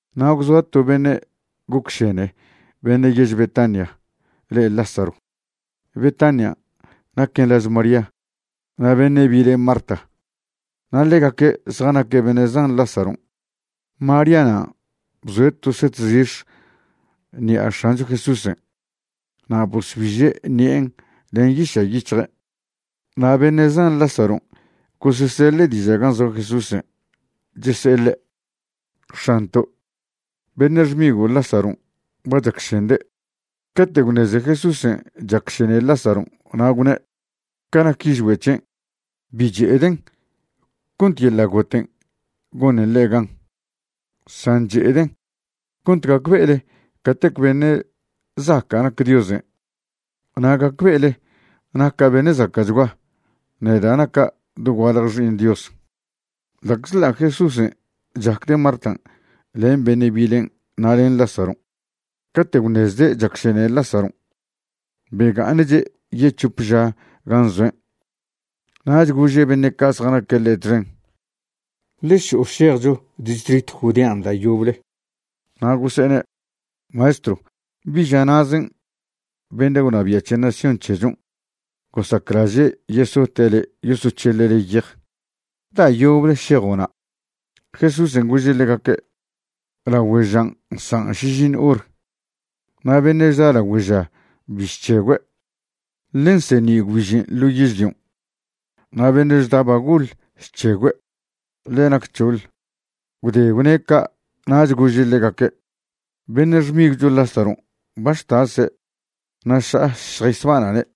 Na' gwzoa to beṉe' gocšene beṉe' yež Betania le' Lázaro. Betania naquen laž María na' beṉe' bile' Marta, na' ḻegaque' zjanaque' beṉe' zan Lázaron'. María nan' bzoe' to set zix̱ ṉi'a X̱ancho Jesúsen' na' bosbiže' ṉi'en len yiša' yic̱hje'. Na' beṉe' zan Lázaron' goseseḻe' diža' gan' zoa Jesúsen', chese'e ḻe': ―X̱anto', beṉe' xmigo' Lázaron' ba chacšende'. Cate' gwṉeze Jesúsen' chacšene Lažaron', na' gwne': ―Ca nac yižgüe' c̱hen', bi che'eden' cont yeḻa' goten' gonen ḻe' gan, san che'eden' cont gacbe'ele catec beṉe' zaca' nac Diosen' na' gacbe'ele naca' beṉe' zaca'chgua, neda' naca' dogualje Xi'iṉ Dios. Ḻa'czḻa' Jesúsen' chacde' Martan' len beṉe' bilen' na' len Lázaron', cate' gwṉezde' chacšene Lázaron', bega'aṉche' yec̱hope ža gan' zoen'. Nach gože' beṉe' ca' zjanaque' ḻe' txen: ―Ḻe šo'o šejcho distritw Judean' da' yoble. Na' gose'ene': ―Maestrw, bi ža na'zen' beṉe' gwnabia' c̱he nación c̱hechon' gosaclaže' yesote' le' yosoc̱heḻe' le' yej. ¿Da' yoble šejo' na'? Jesúsen' gože' ḻegaque': ―Lagüe žan' nsa' šižiṉw hor, na' beṉe' chda lagüe ža bi chc̱hegüe', ḻe nseṉi' gwbižen' ḻo yežlion'. Na' beṉe' chda ba goḻ chc̱hegüe', ḻe nac c̱hoḻ. Gwde gwne' ca' nach gože' ḻegaque': ―Beṉe' xmigwcho Lázaron' ba chtase' na' ša'a šjaysbana'ne'.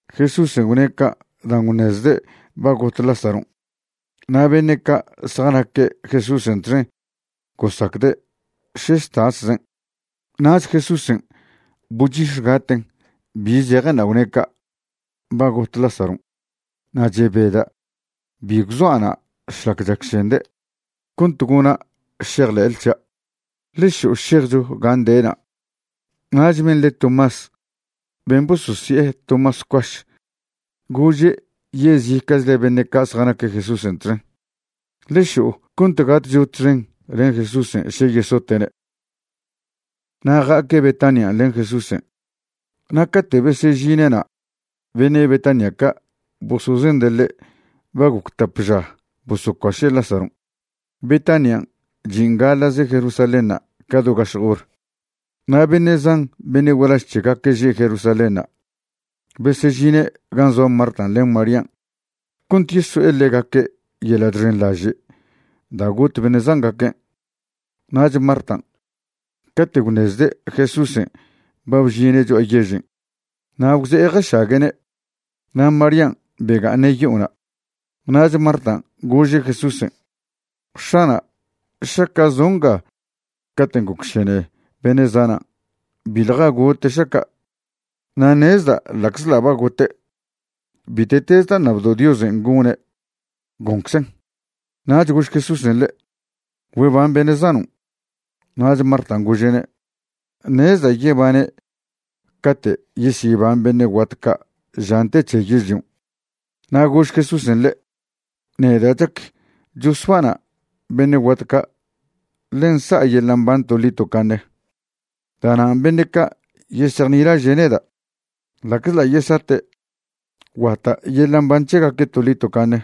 Jesúsen' gwne' ca' dan' gwṉezde' ba got Lázaron', na' beṉe' ca' zjanaque' Jesúsen' txen gosacde' še chtaszen'. Nach Jesúsen' bochix̱gaten' bi zejenṉa' gwne' ca': ―Ba got Lázaron'. Na' chebeda' bi gwzoa' na' šlac chacšende', cont gona' šejḻe'le c̱hia'. Ḻe šo'o šejcho gan' de'na'. Nach ben' le' Tomás ben' bososi'e Tomás Cuaš gože' yezica'chle beṉe' ca' zjanaque' Jesúsen' txen: ―Ḻe šo'o cont gatcho txen len Jesúsen' še yesote'ne'. Na' ja'aque' Betanian' len Jesúsen', na' cate' besežine'na' beṉe' Betania ca' bosozende' ḻe' ba goc tap ža bosocuaše' Lázaron'. Betanian' chin' gaḻa'ze Jerusalénṉa' ca do gašjw hor. Na' beṉe' zan beṉe' gualaž c̱hegaque' že' Jerusalénṉa' besežine' gan' zoa Martan' len Marían' cont yeso'e ḻegaque' yeḻa' chxenḻaže' da' got beṉe' zangaquen'. Nach Martan', cate' gwṉezde' Jesúsen' ba bžine' cho'a yežen', na' gwze'e jašague'ne'. Na' Marían' bega'aṉe' yo'ona'. Nach Martan' gože' Jesúsen': ―X̱ana', šaca' zo' nga caten' gocšene beṉe' zanan' biḻja gote' šaca'. Na' ṉezda' ḻa'czḻa' ba gote', bite'tez da' ṉabdo' Diosen' gone', gonczen'. Nach gož Jesúsen' ḻe': ―Güeban beṉe' zanon'. Nach Martan' gože'ne': ―Ṉezda' yebane' cate' yesyeban beṉe' guat ca' žan' te c̱he yežlion'. Na' gož Jesúsen' ḻe': ―Neda' chac chosbana' beṉe' guat ca' ḻe nsa'a yeḻa' mban toḻi tocaṉe. Da'nan' beṉe' ca' yesejnilaže' neda', ḻa'czḻa' yesate', guata' yeḻa' mban c̱hegaque' toḻi tocaṉe.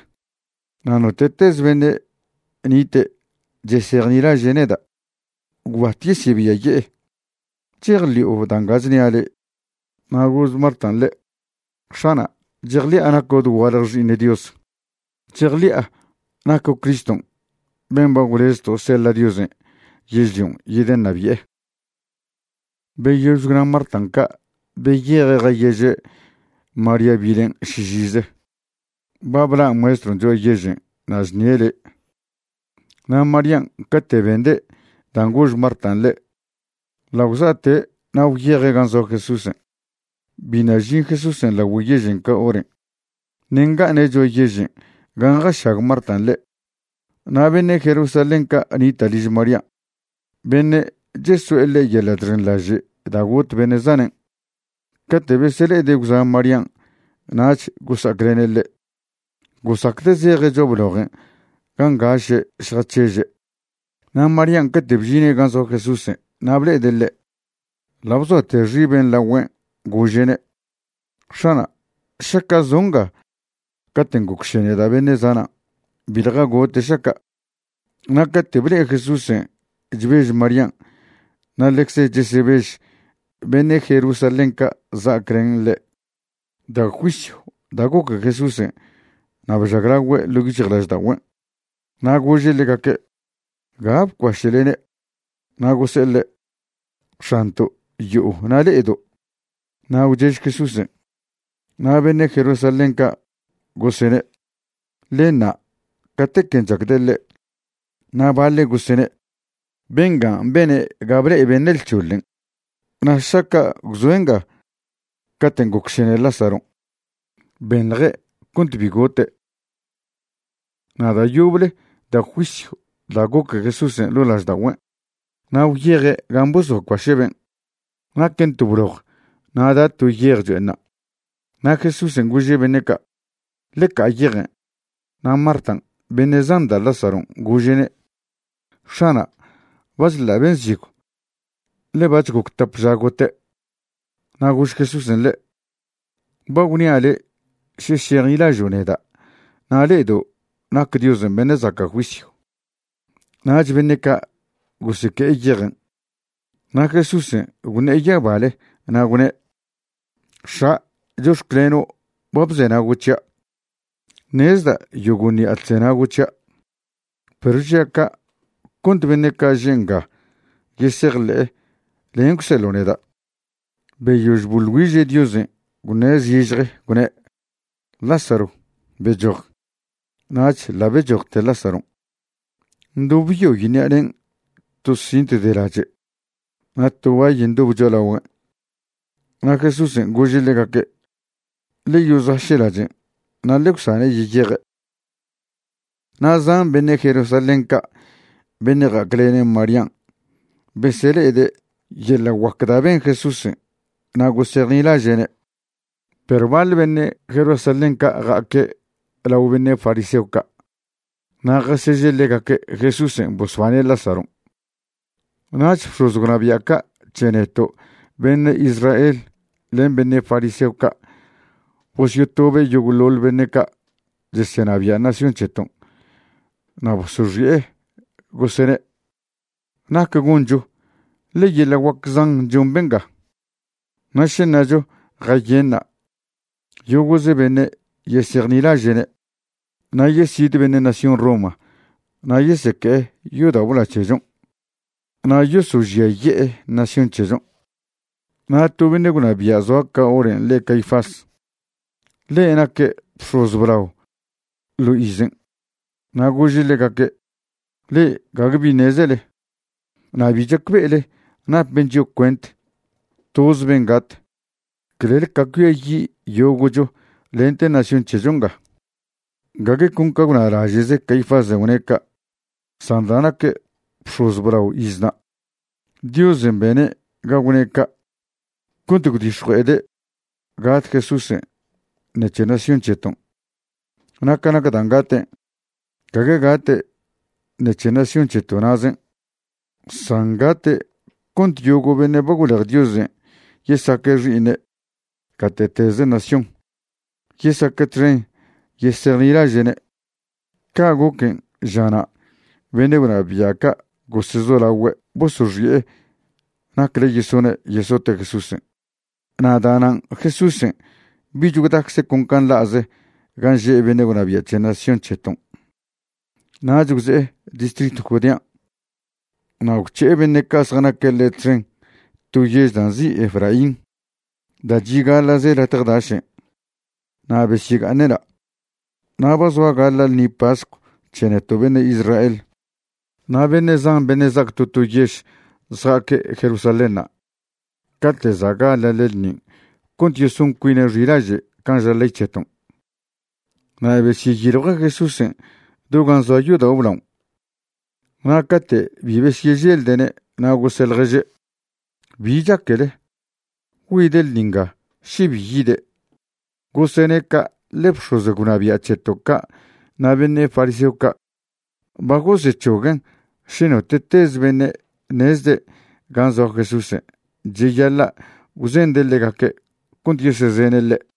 Na' note'tez beṉe' nite' chesejnilaže' neda', gwbat yesebiaye'e. ¿Chejḻi'o da' nga chnia' le'? Na' gož Martan' ḻe': ―X̱ana', chejḻi'a naco' dogualje Xi'iṉ Dios. Chejḻi'a naco' Criston' ben' ba gwlezto' seḻa' Diosen' yežlion' yedeṉabi'e. Beyož gwna Martan' ca' beyeje' jayeže' María bilen' šižize: ―Ba bla' Maestron' cho'a yežen' na' chṉie' le'. Na' Marían' cate' bende' dan' gož Martan' ḻe' ḻa' gwza'te' na' gwyeje' gan' zoa Jesúsen'. Biṉa' žin Jesúsen' lagüe yežen' ca horen', ṉe' nga'aṉe' cho'a yežen' gan' jašag Martan' ḻe'. Na' beṉe' Jerusalén ca' nita' liž María, beṉe' cheso'e ḻe' yeḻa' chxenḻaže' da' got beṉe' zanen', cate' besele'ede' gwza' Marían' nach gosa'aclene' ḻe', gosacde' zeje' cho'a blojen' gan' ngaše' zjac̱heže'. Na' Marían' cate' bžine' gan' zoa Jesúsen' na' ble'ede' ḻe', ḻa' bzoate xibe' lagüen', gože'ne': ―X̱ana', šaca' zo' nga caten' gocšene da' beṉe' zanan', biḻja gote' šaca'. Na' cate' ble'e Jesúsen' chbež Marían' na' ḻecze chesebež beṉe' Jerusalén ca' za'aclene' ḻe', da' juisyw da' goque Jesúsen' na' bžaglagüe' ḻo' yic̱hjlažda'ogüen'. Na' gože' ḻegaque': ―¿Ga bcuaše'lene'? Na' gose'e ḻe': ―X̱anto', yo'o na' le'edo'. Na' gwchež Jesúsen'. Na' beṉe' Jerusalén ca' gosene': ―Ḻe ṉa' catequen' chacde' ḻe'. Na' baḻe' gosene': ―Bengan' bene' ga ble'e beṉe' lc̱hoḻen', na' šaca' gwzoe' nga caten' gocšene Lázaron', benḻje' cont bi gote'. Na' da' yoble da' juisyw da' goque Jesúsen' ḻo' lažda'ogüen'. Na' gwyeje' gan' bosocuaše' ben'. Naquen to bloj na' da' to yej cho'enṉa'. Na' Jesúsen' gože' beṉe' ca': ―Ḻe ca'a yejen'. Na' Martan' beṉe' zan da' Lázaron' gože'ne': ―X̱ana', ba chḻa' ben' zigw, ḻe bac̱h goc tap ža gote'. Na' gož Jesúsen' ḻe': ―Ba gwnia' le' še šejnilažo' neda' na' le'edo' nac Diosen' beṉe' zaca' juisyw. Nach beṉe' ca' goseque'e yejen'. Na' Jesúsen' gwṉe'e yabale na' gwne': ―X̱a', chox̱cleno' ba bzenago' c̱hia'. Ṉezda' yogo' ṉi'a chzenago' c̱hia', perw žia' ca' cont beṉe' ca' že' nga yesejḻe'e len' gwseḻo' neda'. Beyož boḻ güiže' Diosen', gwṉe' zižje, gwne': ―Lázaro, bechoj. Nach ḻa' bechojte Lázaron' ndobyoy ṉi'a ne'en to cint de lache' na' to bay ndobe cho'alagüen'. Na' Jesúsen' gože' ḻegaque': ―Ḻe yozaše' lachen' na' ḻe gwsane' yeyeje'. Na' zan beṉe' Jerusalén ca' beṉe' ja'aclene' Marían' besele'ede' yeḻa' guac da' ben Jesúsen' na' gosejnilaže'ne'. Perw baḻ beṉe' Jerusalén ca' ja'aque' lao beṉe' fariseo ca' na' jaseže' ḻegaque' Jesúsen' bosbane' Lázaron'. Nach bx̱oz gwnabia' ca' c̱he neto' beṉe' Israel len beṉe' fariseo ca' bosyotobe' yogo'ḻoḻ beṉe' ca' chesenabia' nación c̱heton'. Na' bosoxi'e gosene': ―¿Nac goncho? ḻe yeḻa' guac zan chon benga. Na' še ṉacho jayenṉa', yogo'ze beṉe' yesejnilaže'ne', na' yesid beṉe' nación Roma na' yeseque'e yodao' blao c̱hechon' na' yosožiaye'e nación c̱hechon'. Na' to beṉe' gwnabia' zoa ca horen' le' Caifás. Ḻe' naque' bx̱oz blao ḻo izen'. Na' gože' ḻegaque': ―Le'e gague bi ṉezele. Na' bi chacbe'ele napen chio' cuent toz ben' gat, clel ca cuiayi' yogo'cho lente nación c̱hecho nga. Gague con ca gwnalaže'ze Caifásen' gwne' ca', san da' naque' bx̱oz blao iznan', Diosen' bene' ga gwne' ca' cont gwdix̱jue'ede' gat Jesúsen' ṉec̱he nación c̱heton'. Na' ca nac dan' gaten', gague gate' ṉec̱he nación c̱heto' na'zen' san gate' cont yogo' beṉe' ba gwlej Diosen' yesaque' xi'iṉe' gate'teze nación, yesaque' txen yesejnilaže'ne'. Ca' goquen', žana' beṉe' gwnabia' ca' gosezolagüe' bosoxi'e nacle yesone' yesote' Jesúsen'. Na' da'nan' Jesúsen' bich gwdacze' con can' nḻa'ze gan' že' beṉe' gwnabia' c̱he nación c̱heton'. Nach gwze'e distritw Judean' na' gwc̱he'e beṉe' ca' zjanaque' ḻe' txen to yež da' nzi' Efraín da' chi' gaḻa'ze latje dašen', na' besyega'aṉe' na'. Na' ba zoa gaḻa' ḻṉi pascw c̱he neto' beṉe' Israel. Na' beṉe' zan beṉe' za'ac to to yež zja'aque' Jerusalénṉa' cate' za' gaḻa'le ḻṉin' cont yeson cuine' xilaže' can' ža ley c̱heton'. Na' besyeyiljue' Jesúsen' do gan' zoa yodao' blaon' na' cate' bi besyeželde'ne' na' gose' ḻježe': ―¿Bi chaquele? ¿Güide' ḻṉi nga, še bi yide'? Gosene' ca' ḻe bx̱oz gwnabia' c̱heto' ca' na' beṉe' fariseo ca' ba gosec̱hoguen' še note'tez beṉe' ṉezde' gan' zoa Jesúsen' cheyaḻa' gwzende' ḻegaque' cont yesezene' ḻe'.